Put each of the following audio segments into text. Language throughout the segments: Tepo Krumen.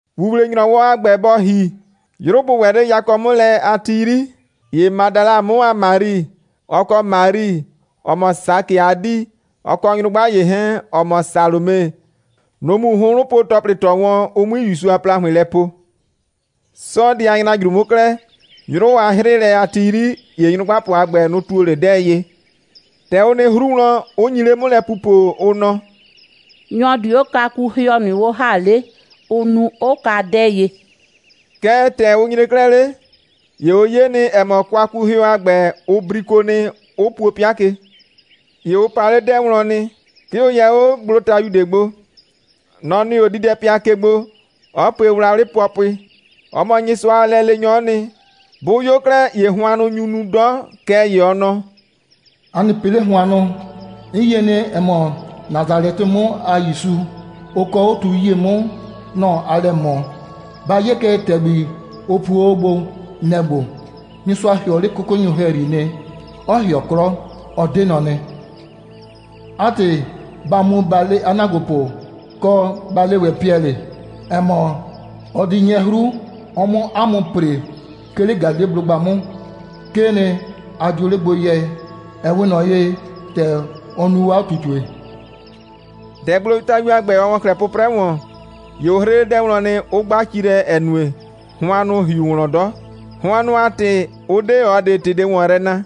‑Wuwle‑nyrɔwɔ a ‑gbɛ bɔ ‑hi, 'yrʋ bʋ ‑wɛ 'le yakɔ 'mʋ lɛ a ti 'yri, ‑ye Madala 'mʋ a Mari, ɔ kɔ Mari, ‑ɔ mɔ Sakɩ a 'dii, ɔ kɔ nyrʋgba ‑ye 'hɛɛn, ‑ɔ mɔ Salome, nʋ‑ mu hʋnhrʋnpo‑tɔplɩ ‑tɔ wɔn, ʋ 'mui ‑Yusu a ‑plahʋɩn lɛ po. 'Sɔɔdɩ a ‑nyrajru 'mʋ 'klɛɛ, 'yrʋ a 'hrɩɩlɛ a ti 'yri, ‑ye nyrʋgbapʋ a ‑gbɛ, nʋ‑ ‑tuo 'le 'dɛɛ ye. ‑Tɛ ʋ nɩ 'hru wlɔn, 'ʋ nyi 'le 'mʋ lɛ pupo, ʋ nɔ: «Nyɔ‑ di 'o kwakuhɩɔ ꞊nʋ 'o ‑ha 'le, ʋ nu, 'ʋ ka 'dɛɛ ye?» Kɛɛ, ‑tɛ ʋ nyre 'klɛɛ 'le, ‑ye ʋ 'ye nɩ, ‑ɛ mɔ, kwakuhɩɔ a ‑gbɛ, ʋ briko nɩ, 'ʋ puo 'pɩa ke. ‑Ye ʋ pa 'le 'dɛɛ wlɔn nɩ. 'Ke ʋ yɛ 'o gblotayu ꞊de gbo. Nɔ‑ nɩ 'o diidɛpɩa ke gbo, 'ɔ pue wlawlɩ pʋɔpʋɩ. Ɔ mɔ Nyɩsʋa a lɛleenyɔ'ɔ nɩ. Bʋ 'yo 'klɛɛ, ‑ye hʋannʋ nyu nu 'dɔ. Kɛɛ ‑ye ɔ nɔ: «A nɩ pɩ 'le hʋannʋ! 'N yie nɩ, ‑ɛ mɔ, Nasalɛtɩ 'mʋ a ‑Yusu, ʋ kɔɔ 'o tu 'yie 'mʋ, nɔ‑ aa lɛ ꞊mɔ. Ba 'ye kɛ, ‑tɛgbi, ʋ puo o 'o gbo, nɛ‑ ‑gbo. Nyɩsʋa ‑hɩɔ 'le 'kʋkʋnyʋ ‑hɛyri nɩ, 'ɔ ‑hɩɔ 'klɔ. Ɔ 'de nɔ nɩ. 'A ‑tɩ, ba mu, ba le 'a ‑naagbopʋ, kɔ, ba le ‑wɛ Piɛlɩ, ‑ɛ mɔ, ɔ di 'nyɛ 'hru, ɔ 'mʋ 'a mʋ ‑pre, 'ke 'le Galileblʋgba 'mʋ. 'Kee nɩ, a dio 'le gbo yɛ, ‑ɛ 'we ꞊nɔ ye, ‑tɛ ɔ nu o 'a ꞊tutue.» ‑Tɛ gblotayu a ‑gbɛ, ɔ ‑wɔ 'klɛɛ 'pʋprɛ ‑wɔn, ‑ye ʋ 'hrɩ 'le 'dɛɛ wlɔn nɩ, 'ʋ 'gba ci lɛ, ‑ɛ nue, hʋannʋ ‑hi ꞊nʋ wlɔn 'dɔ. Hʋannʋ a ‑tɩ ʋ 'de ꞊ɔ ꞊de ‑tɩ ꞊de ‑wɔn yrɛ na. [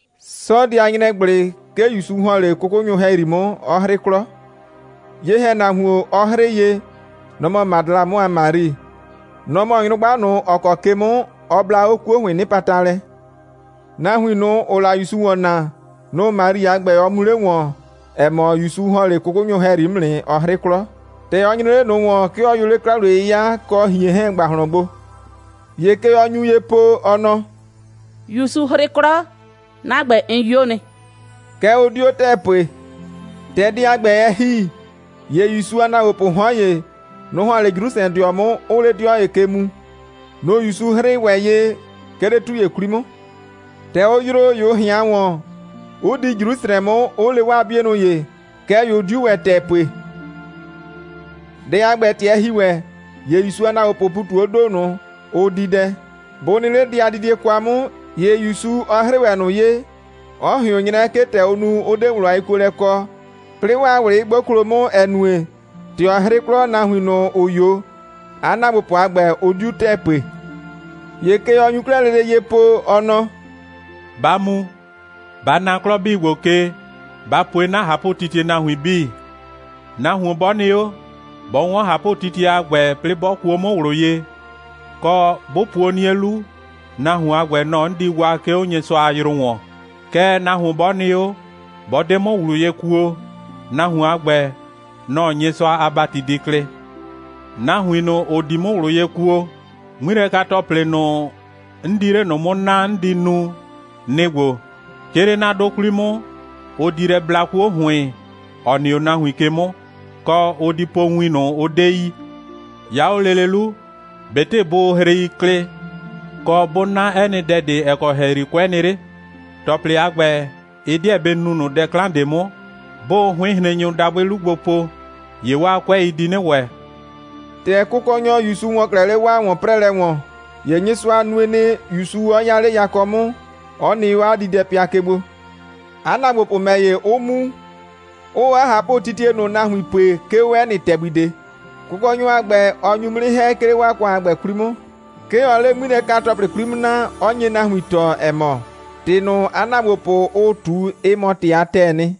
'Sɔɔdɩ a ‑nyrɛgblɩ, 'ke ‑Yusu ‑hɔn 'le 'kʋkʋnyʋ ‑hɛyri 'mʋ, 'ɔ 'hrɩ 'klɔ. Ye‑hɛnahuon, ɔ 'hrɩɩ ye, nɔ‑ mɔ Madala 'mʋ a Mari. Nɔ‑ mɔ nyrʋgba ꞊nʋ, ‑ɔ kɔ ke 'mʋ ɔ bla 'o 'kuo ‑hʋɩɩn 'nɩpata lɛ. Nahuin ꞊nʋ, ‑ʋʋ la ‑Yusu ‑wɔn naa, nʋ‑ Mari a ‑gbɛ, ɔ mu le wɔn, ‑ɛ mɔ, ‑Yusu ‑hɔn 'le 'kʋkʋnyʋ ‑hɛyri 'mʋ nɩ, 'ɔ 'hrɩ 'klɔ. ‑Tɛ ɔ nyre 'le ꞊nʋ ‑wɔn, 'ke ɔ yʋ 'le 'kla‑wliye'yɩya kɔ ꞊hien 'hɛɛn ‑gbahlɔn gbo. ‑Ye kɛ ɔ nyu ye po, ɔ nɔ: «‑Yusu 'hrɩ 'klɔ, 'na ‑gbɛ, 'n 'yo nɩ.» Kɛɛ, ʋ 'dio ‑tɛɛ pue. ‑Tɛ dɛ a ‑gbɛ, ɛ ‑hi, ‑ye ‑Yusu a ‑naagbopʋʋ 'hɔn ‑ye, nʋ‑ ‑hɔn 'le Jrusrɛdɩɔ 'mʋ, 'ʋʋ 'le 'dɩɔ ‑ye ke mu. Nʋ‑ ‑Yusu 'hrɩɩ ‑wɛ ye, 'ke 'le 'tu ‑ye 'kwli 'mʋ. ‑Tɛ ʋ yroo, ‑ye ʋ ꞊hɩan ‑wɔn, 'ʋ di Jrusrɛ 'mʋ, 'ʋ le 'waa 'bienʋ ‑ye. Kɛɛ ‑ye ʋ 'diu ‑wɛ ‑tɛɛ pue. Dɛ a ‑gbɛ, ‑tɛ ɛ ‑hi ‑wɛ, ‑ye ‑Yusu a ‑naagbopʋʋ ‑pu ꞊tu 'o ‑do ꞊nʋ, ʋʋ di dɛ. Bʋ nɩ 'le dɛ a didie kwa 'mʋ, ‑ye ‑Yusu, ɔ 'hrɩɩ ‑wɛ ꞊nʋ ye, 'ɔ ꞊hɩʋn 'nyrɛ, 'ke ‑tɛ ʋ nu, 'ʋ 'de ꞊wlʋ a yekuolɛ kɔ, 'plɩɩ 'waa ꞊wlɩ 'ɩ 'gboklo 'mʋ, ‑ɛ nue, ‑tɛ ɔ 'hrɩ 'klɔ, nahuin ꞊nʋ, ‑ʋ 'yo, 'a ‑naagbopʋ a ‑gbɛ, ʋ 'diu ‑tɛɛ pue. ‑Ye kɛ ɔ nyu 'klɛɛ lele ye po, ɔ nɔ: «Ba mu, ba na 'klɔ 'bii ‑gbo ke, ba pue 'na ꞊hapʋtitie nahuin 'bii. Nahuon 'bɔ nɩ 'o, 'bɔ 'wɔn ꞊hapʋtitie a ‑gbɛ, 'plɩɩ 'bɔ kuo 'mʋ ꞊wlʋ ye, kɔ, 'bʋ puo 'nie 'lu, nahuon a ‑gbɛ, nɔ‑ 'n di waa, 'ke 'o Nyɩsʋa a yrʋ ‑wɔn. Kɛɛ, nahuon 'bɔ nɩ 'o, 'bɔ 'de 'mʋ ꞊wlʋ ye kuo, nahuon a ‑gbɛ, nɔ‑ Nyɩsʋa a ‑bati di klɩ. Nahuin ꞊nʋ, ‑ʋ di 'mʋ ꞊wlʋ ye kuo, 'ŋmilɛka‑tɔplɩ ꞊nʋ, 'n di 'le ꞊nʋ 'mʋ naa, 'n di nu, nɩ‑ ‑gbo: 'Ke 'le 'na 'dʋ 'kwli 'mʋ, ʋ di lɛ bla 'kuo ‑hʋɩn, ‑ɔ nɩ 'o nahuin ke 'mʋ, kɔ, ʋ di po win ꞊nʋ, ʋ 'de yi. 'Ya 'o lele 'lu, ꞊betɩ bʋʋ hrei klɩ, kɔ, bʋ 'na 'ɛ nɩ dɛ ꞊de, ‑ɛ kɔ ‑hɛyri 'kʋɛ nɩ 'le, ‑tɔplɩ a ‑gbɛ, ɩ 'deɛ bɩ nu ꞊nʋ dɛ 'klan ꞊de 'mʋ. 'Bʋʋ 'hʋɩnhrennyʋ dabʋɩ 'lu gbo po, ‑ye 'waa 'kʋɛi di 'nɩ ‑wɛ.» ‑Tɛ Kʋkɔnyɔ ‑Yusu ‑wɔ 'klɛɛ 'le 'waa ‑wɔn'prɛɛlɛ ‑wɔn, ‑ye Nyɩsʋa nue nɩ, ‑Yusu 'ɔ 'ya 'le yakɔ 'mʋ, 'ɔ nɩ 'o 'a diidɛpɩa ke gbo. 'A ‑naagbopʋ ‑mɛ ‑ye, 'ʋ mu, 'ʋʋ 'a ꞊hapʋtitie ꞊nʋ nahuin pue, 'ke 'o 'ɛ nɩ ‑tɛgbi ꞊de. Kʋkɔnyɔ a ‑gbɛ, ɔ nyu 'mʋ 'nɩ ‑hɛ, 'ke 'le 'waa ‑kʋan a ‑gbɛ 'kwli 'mʋ. 'Ke ɔɔ 'le 'ŋmilɛka‑tɔplɩ 'mʋ naa, 'ɔ nye nahuin tɔɔ, ‑ɛ mɔ, ‑tɩ ꞊nʋ, 'a ‑naagbopʋ, ʋʋ ꞊tu, ɩ mɔ ‑tɩ a ‑tɛɛ nɩ.]